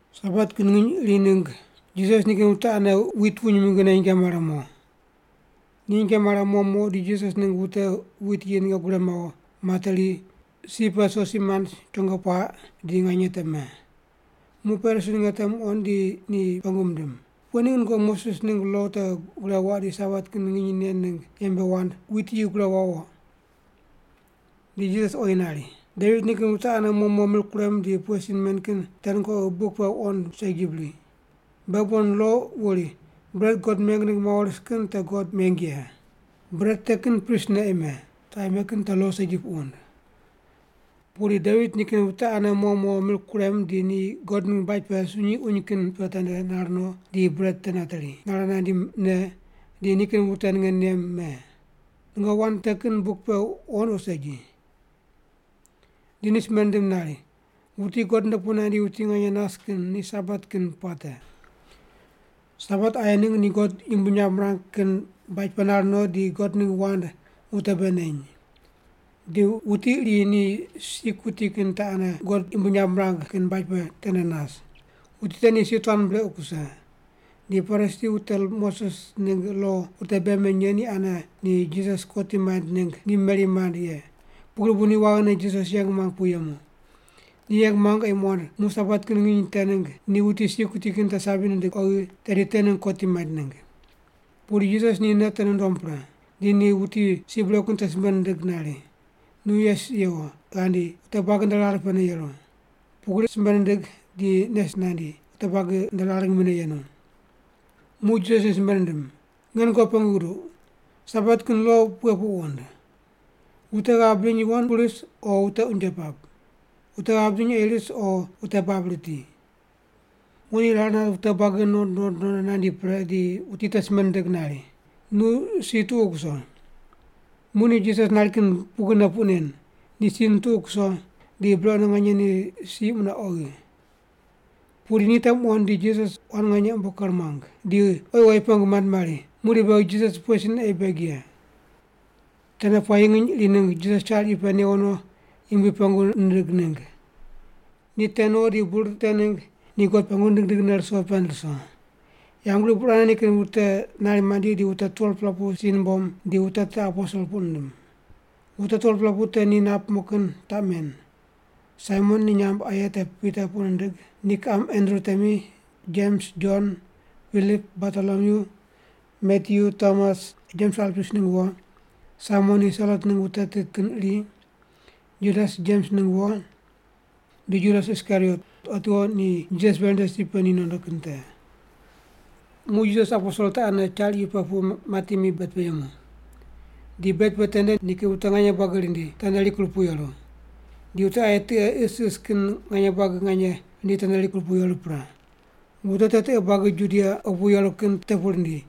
Sabat kin nginy iri ningg Jisas nikin wute ane wit wuny mingine nyinge mare mo. Ni nyinge mare mo mo di Jisas ningg wute wit yi ninge gure mawo, materi, si pe sosi mand, chongo puaq di nganye te me. Muq Parisi ninge te muqond di ni pengu mindim, “Pughe ningg nungoqi Moses ningg lo te gure waq di Sabat kin nginy nen ningg yembe wand wit yi gure wawo?” Di Jisas oyi nari, “Devit nikin wute ane mo mo mir kurem di pughe sin men kin te nungoqi buk pe wuqond segi bri? Beghi bon lo wuri bret God meng ningg mawo ris kin te God meng ye. Bret te kin pristne ei me, wute aye me kin te lo segi puq wund. Pudi Devit nikin wute ane mo mo mir kurem di ni God ningg baj pe sunyi uny kin pe tende nar no di bret te nateri, nare nandi ne, di nikin wute ninge nem me. Nungoqi wand te kin buk pe wuqond o segi?” Di ni simbe nindim nari, “Wuti God nde pu nandi wuti nganye nas kin ni Sabat kin puate.” Sabat aye ningg ni God yumbui nyamb mirang kin baj pe nar no di God ningg wand wute bei neny. Di wuti iri ni si kuti kin te ane God yumbui nyamb mirang kin baj pe tende nas. Wuti te ni si tuan brequ kuse. Di Parisi wute Moses ningg lo wute bei meny ye ane ni Jisas kotim maind ningg ngim meri mand ye, pugri bu ni waghine Jisas yeng muang pu yemu. Ni yeng muang ei muqond muq Sabat kin nginy te ningg ni wuti si kuti kin te sabi nindig oghi, tedi te ningg kotim maind ningg. Pudi Jisas ni nei te nundom pre. Di ni wuti si brequ kin te simbe nindig nari, “Nu yes yewo, ghandi, wute buagi nde rar pe yeru.” Pugri simbe nindig di nes nandi, wute buagi nde rar ngimine yenu. Muq Jisas ni simbe nindim, “Nge nungoqi pengu guduq, Sabat kin lo pughe puq wund? Wute ghav bidiny yuwon pu ris, o wute unje pap? Wute ghav bidiny ei ris o wute bab riti?” Muq ni rar nat wute buagi nuqond nuqond nondo nandi pre di wuti te simbe nindig nari, “Nu si tuqu kuso.” Muq ni Jisas nari kin pugrine puq nen, ni si nituqu kuso, di brequne nganye ni si mune oghi. Pudi ni te muqond di Jisas quan nganye umbo ker muang. Di oyi oyi pengu mand mari, “Muqdi beghi Jisas pughe sin ei beg ye?” Tende puayi nginy iri ningg Jisas char iyu pe newo no Yumbui pengu nindig ningg. Ni te no di bur te ningg ni God pengu nindig nindigne ruso pend ruso. Yambgriq burane nikin wute nari mandi di wute 12-pela pu si numbom di wute te aposel puq nindim. Wute 12-pela pu te ni nap mo kin taq men: Saimon (ni nyamb aye te Pita puq nindig) ni kiqam Andru temi, Jems, Jon, Pilip, Bartolomyu, Matyu, Tomas, Jems Alpius ningg wo, Saimon ni Selot ningg wute tit kin iri, Judas Jems ningg wo, di Judas Iskariot otiwo ni Jisas veri nde si pe ni nondo kin te. Muq Jisas aposel te ane char iyu pe pu mati mi bed pe yemu. Di bed pe tende nikin wute nganye buagi rindi, tende rikur pu yeru. Di wute aye tiqe isis kin nganye buagi nganye rindi tende rikur pu yeru pre. Wute te tiqe buagi Judia opu yeru kin te pu rindi,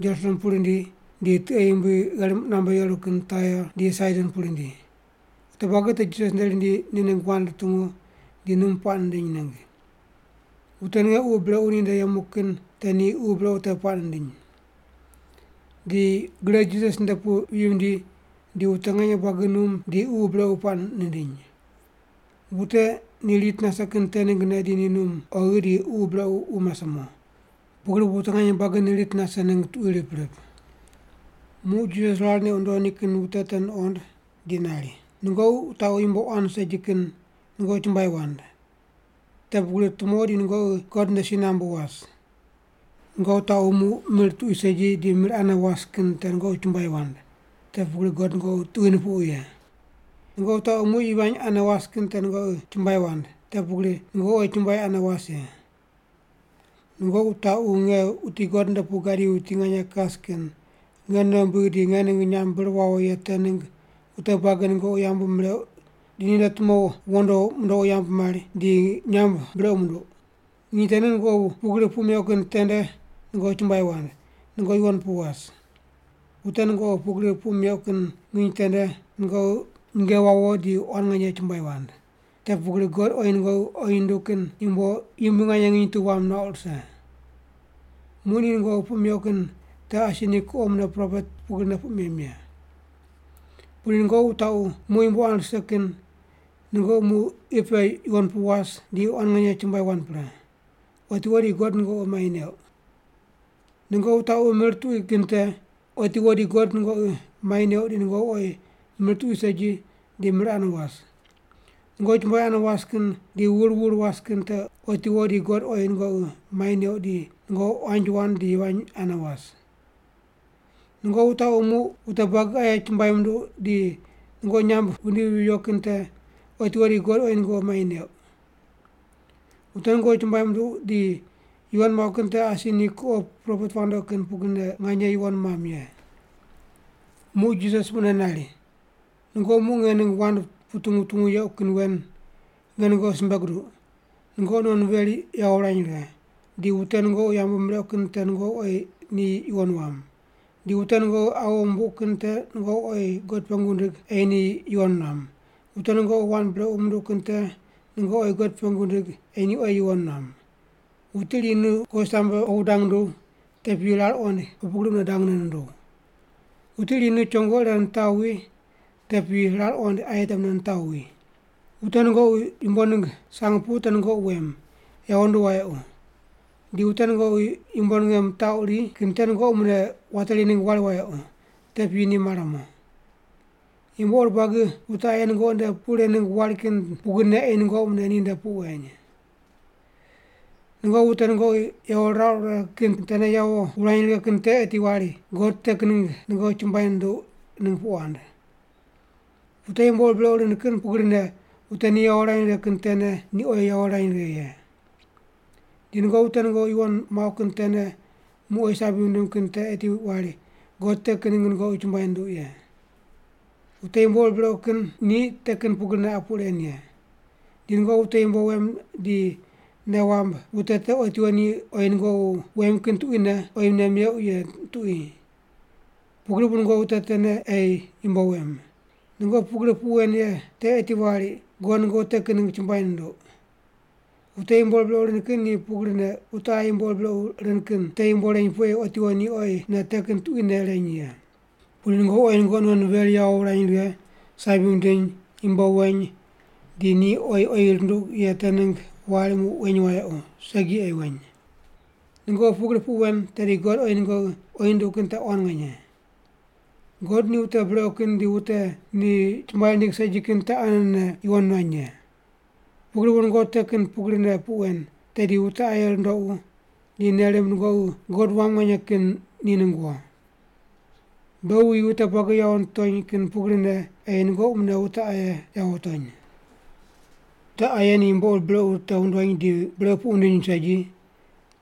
Jerusalem pu rindi di tiqe yumbui gherim qunambe yeru kin Tair di Saidon pu rindi. Wute buagi te Jisas nde rindi ni ningg wand rutungu di num puaq nindiny ningg. Wute ninge ququ brequ ni nde yemu kin te ni ququ brequ te puaq nindiny. Di gre Jisas nde pu viyi vindi di wute nganye buagi num di ququ brequ puaq nindiny. Wute ni rit nase kin te ninggne di ni num oghi di ququ brequ wu mase mo. Pugri bu wute nganye buagi ni rit nase ningg tuqui rip rip. Muq Jisas rar neq wundo nikin wute te nuqond di nari, “Nungoqi wutaqu yumbo quan segi kin nungoqi chumbuai wand, te pugri tumo di nungoqi God nde si nambu was. Nungoqi wutaqu muq mir tuqui segi di mir ane was kin te nungoqi chumbuai wand, te pugri God nungoqi tuqui nupuqu ye. Nungoqi wutaqu muq yivany ane was kin te nungoqi chumbuai wand, te pugri nungoqi oyi chumbuai ane was ye. Nungoqi wutaqu nge, wuti God nde pu gadi wuti nganye kas kin, nge nei wumbigh di nge ningg nyamb bir wawo ye te ningg wute buagi nungoqi yambu mireuq di ni nde tumo wondo mundoqu yambu mari, di nyamb brequ munduq. Nginy te ningg nungoqi pugri puq meuq kin tende nungoqi chumbuai wand, nungoqi yuwon pu was. Wute nungoqi pugri puq meuq kin nginy tende nungoqi nyinge wawo di quan nganye chumbuai wand. Te pugri God oyi nungoqi oyi nunduq kin yumbo yumbui nganye nginy tu wam nuauq rise. Muq ni nungoqi puq meuq kin te asi ni kuqo mune propet pugrine puq mem ye. “Pudi nungoqi wutaqu muq yumbo quan rise kin nungoqi muq qi pe yuwon pu was di quan nganye chumbuai wand pre. Otiwo di God nungoqi mai neuq. Nungoqi wutaqu mir tuqui kin te, otiwo di God nungoqi mai neuq di nungoqi oyi mir tuqui segi di mir ane was. Nungoqi chumbuai ane was di wur wur was kin te otiwo di God oyi nungoqi mai neuq di nungoqi quanji wand di yivany ane was. Nungoqi wutaqu muq wute buagi aye chumbuai munduq di nungoqi nyamb mindivi viyo kin te, otiwo di God oyi nungoqi mai neuq. Wute nungoqi chumbuai munduq di yuwon muauq kin te asi ni kuqo propet wandoqi kin pugrine nganye yuwon muam ye.” Muq Jisas mune nari, “Nungoqi muq nge ningg wand wutungu wutungu yequ kin wen, nge nungoqi simbe guduq: Nungoqi non veri yawo wurany righe, di wute nungoqi yambu mireuq kin te nungoqi oyi ni yuwon wam, di wute nungoqi awo mumbuq kin te nungoqi oyi God pengu wundig ei ni yuwon nuam, wute nungoqi wand brequ munduq kin te nungoqi oyi God pengu wundig ei ni oyi yuwon nuam. Wuti iri nu kowisambe opu dang nunduw, te piyi rar qoind opu gri mune dangne nunduw. Wuti iri nu chongo ire nitaw wi, te piyi rar qoind aye te mune nitaw wi. Wute nungoqi yumbo ningg sang mupuq te nungoqi wem, yawo nduq wayequ. Di wute nungoqi yumbo ninge mitaquri kin te nungoqi mune wateri ningg wari wayequ, te piyi ni mare mo. Yumbo ur buagi wute aye nungoqi nde puq ren ningg wari kin pugrine ei nungoqi mune ninde puq weny. “Nungoqi wute nungoqi yawo rirauq righe kin tene yawo wurany righe kin te eti wari God te kin ningg nungoqi chumbuai nunduq ningg puq wand. Wute yumbo ur brequ rind kin pugrine wute ni yawo rirany righe kin tene ni oyi yawo rirany righe ye. Di nungoqi wute nungoqi yuwon muauq kin tene muq oyi sabi wundim kin te eti wari God te kin ningg nungoqi chumbuai nunduq ye. Wute yumbo ur brequ kin ni te kin pugrine qa puq ren ye. Di nungoqi wute yumbo wem di nei wamb wute te otiwo ni oyi nungoqi wem kin tuquine oyi mune meuq ye tuqui. Pugri bu nungoqi wute tene ei yumbo wem. Nungoqi pugri puq wen ye te eti wari God nungoqi te kin ningg chumbuai nunduq. Wute yumbo ur brequ rind kin ni pugrine wute aye yumbo ur brequ rind kin te yumbo reny pu ei otiwo ni oyi mune te kin tuquine reny ye. Pudi nungoqi oyi nungoqi non veri yawo wurany righe, sabi wundiny, yumbo weny di ni oyi oyi runduq ye te ningg wari muq weny wayequ, segi ei weny. Nungoqi pugri puq wen, tedi God oyi nungoqi oyi nunduq kin te quan nganye. God ni wute brequ kin di wute ni chumbuai rindig segi kin te anene yuwon nuany ye. Pugri bu nungoqi te kin pugrine puq wen, tedi wute aye rundoqu di nei rimb nungoqi God wam nganye kin ni ningg wo. Beghi wuyi wute buagi yawo nitony kin pugrine ei nungoqi mune wute aye yawo wutony.” “Wute aye ni yumbo ur brequ te wundony di brequ puq wundiny segi,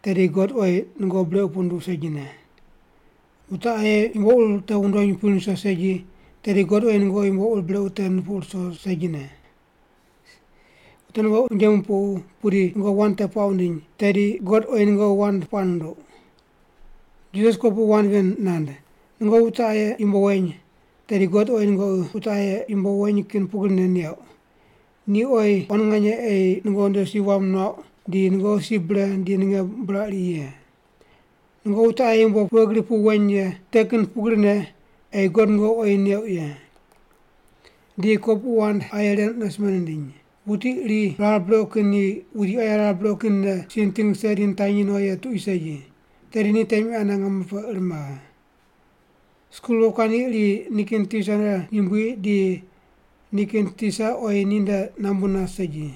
tedi God oyi nungoqi brequ puq nunduq segine. Wute aye yumbo ur te wundony wupiny ruso segi, tedi God oyi nungoqi yumbo ur brequ te rupuqu ruso segine. Wute nungoqi unje mupuq pudi nungoqi wand te puaq wundiny, tedi God oyi nungoqi wand puaq nunduq.” Jisas kopuqu wand ven nand, “Nungoqi wute aye yumbo weny, tedi God oyi nungoqi wute aye yumbo weny kin pugrine neuq. Ni oyi quan nganye ei nungoqi nde si wam nuauq di nungoqi si bre di ninge buraq ri ye. Nungoqi wute aye yumbo pughe gri pu weny ye te kin pugrine ei God nungoqi oyi neuq ye.” Di ni kopuqu wand aye ren mune simbe nindiny: “Wuti iri rar brequ kin ni wuti aye rar brequ kinne si niting rise di nitanyi no ye tuqui segi. Tedi ni temi ane ngamo pe ir maghe. Skul wokuandi iri nikin tisa nde yumbui di nikin tisa oyi ni nde nambu nas segi.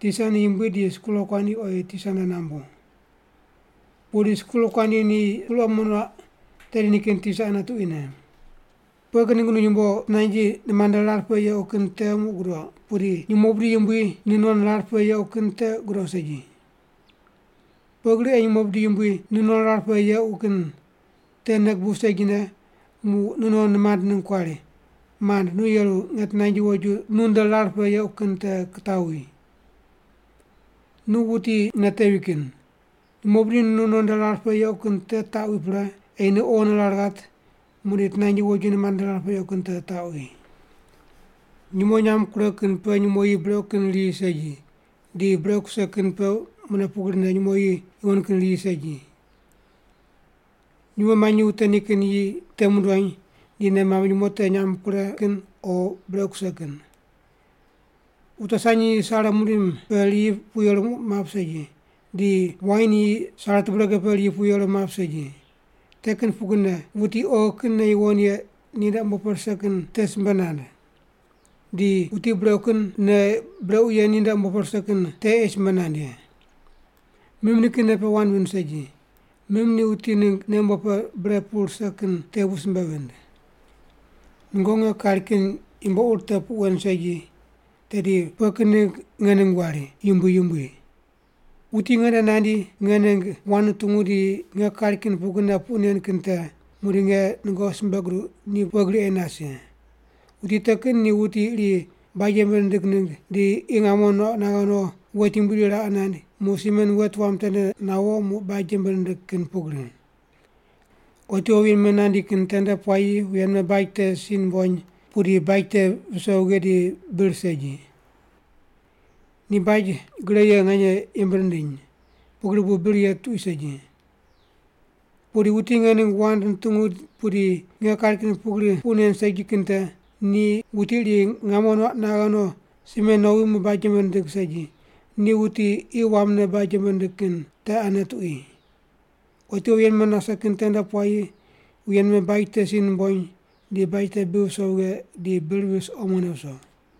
Tisa ni yumbui di skul wokuandi oyi tisa nde nambu. Pudi skul wokuandi ni skul omo nuaq, tedi nikin tisa ane tuquine. “Pughe kin ningg nu yumbo tinanji nimand nde rar pe yequ kin te muq gudoq, pudi nyumo bidi yumbui nu non rar pe yequ kin te gudoq segi? Pughe gri ei nyumo bidi yumbui nu non rar pe yequ kin te nei gubuw segine, muq nu non nimand ningg kuari, ‘Mand, nu yeru nge tinanji woju nu nde rar pe yequ kin te kitaw wi?’ Nu wuti nei tevi kin! Nyumo bidi nu non nde rar pe yequ kin te taqwi pre, ei nu oghine rar ghat, muqdi tinanji woju nimand nde rar pe yequ kin te taqwi.” “Nyumo nyam kure kin pe nyumo yi brequ kin riyi segi, di brequ kuse kin pe mune pugrine nyumo yi yuwon kin riyi segi. Nyumo manyi wute nikin yi te mundony di nei mamb nyumo te nyam kure kin o brequ kuse kin. Wute sanyi yi sare mundim pe riyi pu yeru map segi, di wain yi sare tubrege pe riyi pu yeru map segi. Te kin pugrine wuti oghi kin nei yuwon ye ni nde umbo pe rise kin te simbe nand, di wuti brequ kin nei brequ ye ni nde umbo pe rise kin te ei simbe nand ye. Mim nikin nei pe wand vind segi, mim ni wuti ningg nei umbo pe bre pu rise kin te bu simbe vind.” “Nungoqi nge kari kin yumbo ur te puq wen segi, tedi pughe kin ningg nge ningg wari, ‘Yumbui, Yumbui?’ Wuti nge nde nandi nge ningg wand nutungu di nge kari kin pugrine puq nen kin te, muqdi nge nungoqi simbe guduq ni pughe gri ei nas ye. Wuti te kin ni wuti iri baj yembe nindig ningg di qi ngamo nuaq naghe no wet yumbui iri raqe naind, muq simen wet wam tende nawo muq baj yembe nindig kin pugri. Otiwo wuye nime nandi kin tende puayi wuye nime baj te si numbony, pudi baj te viso vighe di bir segi. Ni baj gre ye nganye yembe nindiny, pugri bu bir ye tuqui segi. “Pudi wuti nge ningg wand nutungu pudi nge kari kin pugri puq nen segi kin te, ni wuti iri ngamo nuaq naghe no simen nowi muq baj yembe nindig segi, ni wuti qi wamne baj yembe nindig kin te ane tuqui. Otiwo wuye nime nase kin tende puayi wuye nime baj te si numbony di baj te bi viso vighe di bir vis omone viso.”